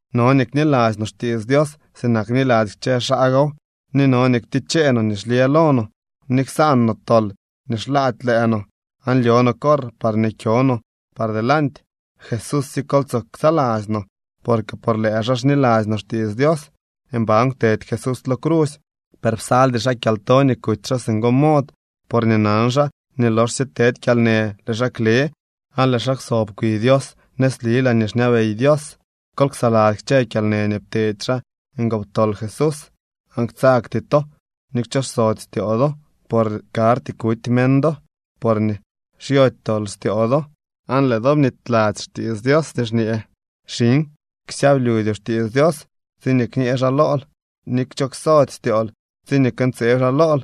No nii kniladzy no xtiits Dios sinak bniladzy kchë xaa gow, ni no nii ktichee no nii xlyë lo no, ni ksaan no tol nii xlaady lëë no, aan lyo no corr parñee kyo no par delanty. Jesúsye kol tsoo ksaladzy no, porque por lëë xaa xniladzy no xtiits Dios. Mban kwtedy Jesús lo crusy, per psaldy xaa kyalto nii kuty xaa singo mod, porñee nan xaa nii loxsye tedy kyalnë lëë xaa kle, aan lëë xaa kwsob kwi Dios nëzli laañee xñabey Dios. Kol ksaladzy kchë kyalnë nii pteedy xaa ngoptol Jesús, aan ktsagty to ni kchooxsody styoo do. Por karty kuty meñ do porñee xyody tol styoo do. Aan lëë do bnityladzy xtiits Dios nii xñee: Xiñ, ksyablyudyoo xtiits Dios tsiñee kñee xaa lool, ni kchooksody styool tsiñee këntseeb xaa lool.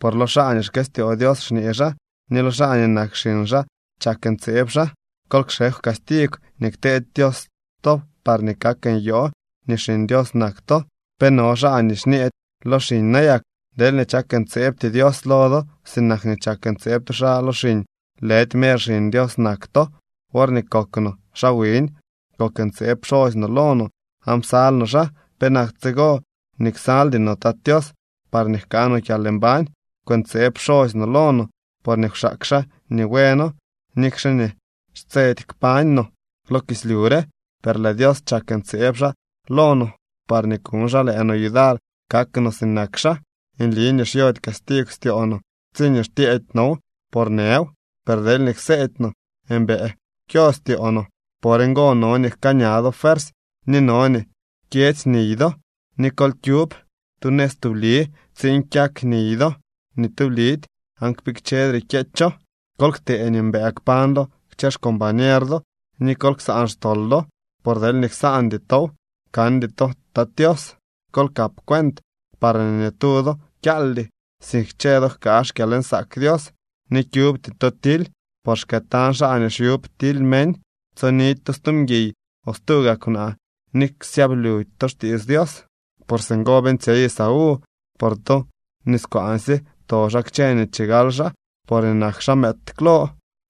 Por lo xaa nii xkëstyoo Dios xñee xaa, ni lo xaa nii nak xiñ xaa chak ntseeb xaa. Kol kxekw castigw nii kteedy Dios to parñee kak nyoo nii xiñ Dios nak to. ¿Pe no xaa nii xñeedy lo xiñ nayak? Deelñee chak ntseebty Dios lo do sinak nii chak ntseeb tu xaa lo xiñ, lëdy mer xiñ Dios nak to. Worñee kok no xaa wiñ, kok ntseeb pxosy no lo no aan psal no xaa. ¿Penak tsigo nii ksaldy no Tat Tios parñee jkaa no kyalmbañ? Kwëntseeb pxosy no lo no porñee kwxaak xaa nii bueno, nikxe nii xtsedy kpañ no lo kislyu re. Per lëë Dios chak ntseeb xaa lo no parñee kuñ xaa lëë no yudar kak no sinak xaa. Nli nii xyody castigw styoo no tsiñee xtyeedy now, por nëw. Per deelñee kseedy no, mbëë kyo styoo no. Por ngo no nii jkaa ña do fuersy, ni no nii jkyedzy niy do. Ni kol kyub tu nëz tubli tsiin kyak niy do nii tublidy aan kpikchedre kyeecho. Kol ktee nii mbëë kpañ do kchë xcombañer do, ni kol ksaan xtol do. Por deelñee ksaandy tow, kandy to Tat Tios. Kol kap cuent parñee ni tu do kyaaldy, sink kchë do jkaa xkyalnsaak Dios. Ni kyubty to tily, por xkëëtañ xaa nii xyub tily meñ. Tsonidy to stu mguiy o stuu gaa kwnaa, ni ksyablyudy to xtiits Dios, por singo beeñtsyey Esaú. Por tu niskwaansye pto xaa kchë nii chigal xaa porñee nak xaa mëëd klo.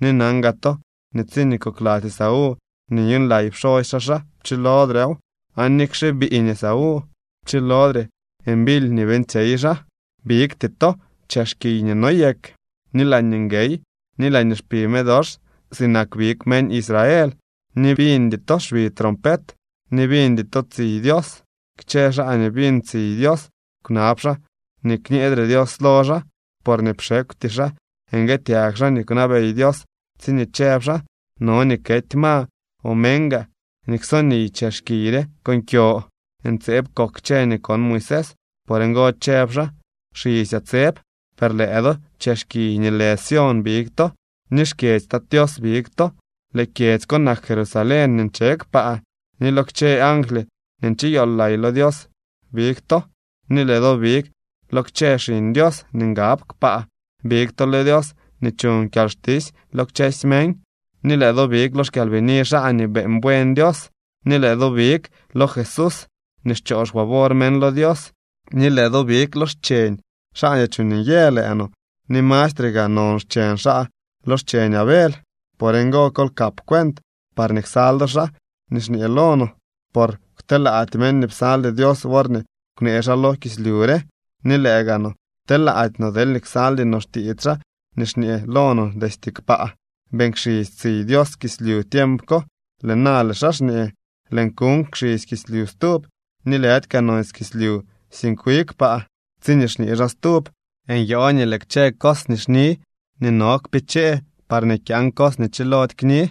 Ni nan gaa to nii tsiñee kokladzy Esaú nii nyuuñlay pxosy xaa xaa, pchilodrew. Aan nikxe biiñ Esaú, pchilodre mbily nii beeñtsyey xaa. Bigty to chex kiy nii noyek, ni laañee nguey, ni laañee xpi medox, sinak big meñ Israel. Ni biñdy to xbi trompet, ni biñdy to tsiy Dios. Kchë xaa nii biñ tsiy Dios kwnab xaa nii kñeedre Dios lo xaa. Porñee pxekwty xaa nguëtyag xaa nii kwnabey Dios tsiñee chëb xaa: “No nii kety ma o meñ gaa nii kso niy chex kiy re con kyo.” Ntseeb kok kchë nii kon Moisés. Por ngo chëb xaa: “Xisyaa tseb.” Per lëë do, chex kiy nii lë Sión big to, ni xkyedzy Tat Tios big to. Lëë kyedzy ko nak Jerusalén nii nche kpaa. Ni lo kchë angly nii ncheyool lay lo Dios big to. Ni lëë do big lo kchë xiñ Dios nii ngab kpaa. Big to lo Dios nii chuñ kyalxtisy lo kchësy meñ, ni lëë do big lo xkyalbini xaa nii beeñ buen Dios. Ni lëë do big lo Jesús nii xchoo xfavor meñ lo Dios, ni lëë do big lo xcheñ xaa nii chuuñ nyë lëë no, ni mastre gaa non xcheñ xaa lo xcheñ Abel. Por ngo kol kap cuent parñee ksal do xaa nii xñee lo no. Por kwtelaady meñ nii psaldy Dios worñee kwnee xaa lo kislyu re, ni lëë gaa no, telaady no deelñee ksaldy no xtiits xaa nii xñee lo no destye kpaa. Beeñ kxisy tsiy Dios kislyu tiemp ko. Lëë na lëë xaa xñee: “Lëën kuuñ kxisy kislyu stub, ni lëdy kaa nonsy kislyu, sink wi kpaa.” Tsiñee xñee xaa “stub”, nyoo nii lëë kchë cos nii xni nii no kpichee parñee kyaan cos nii chilody kni.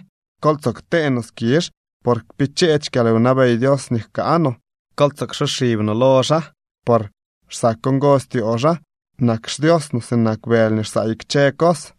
Kol tsoo ktee no skizh, por kpicheedy xkyalwnabey Dios nii jkaa no. Kol tsoo ksoxib lo xaa, por xsak ngo styoo xaa. Nak xDios no sinak bëly nii xsaay kchë cos.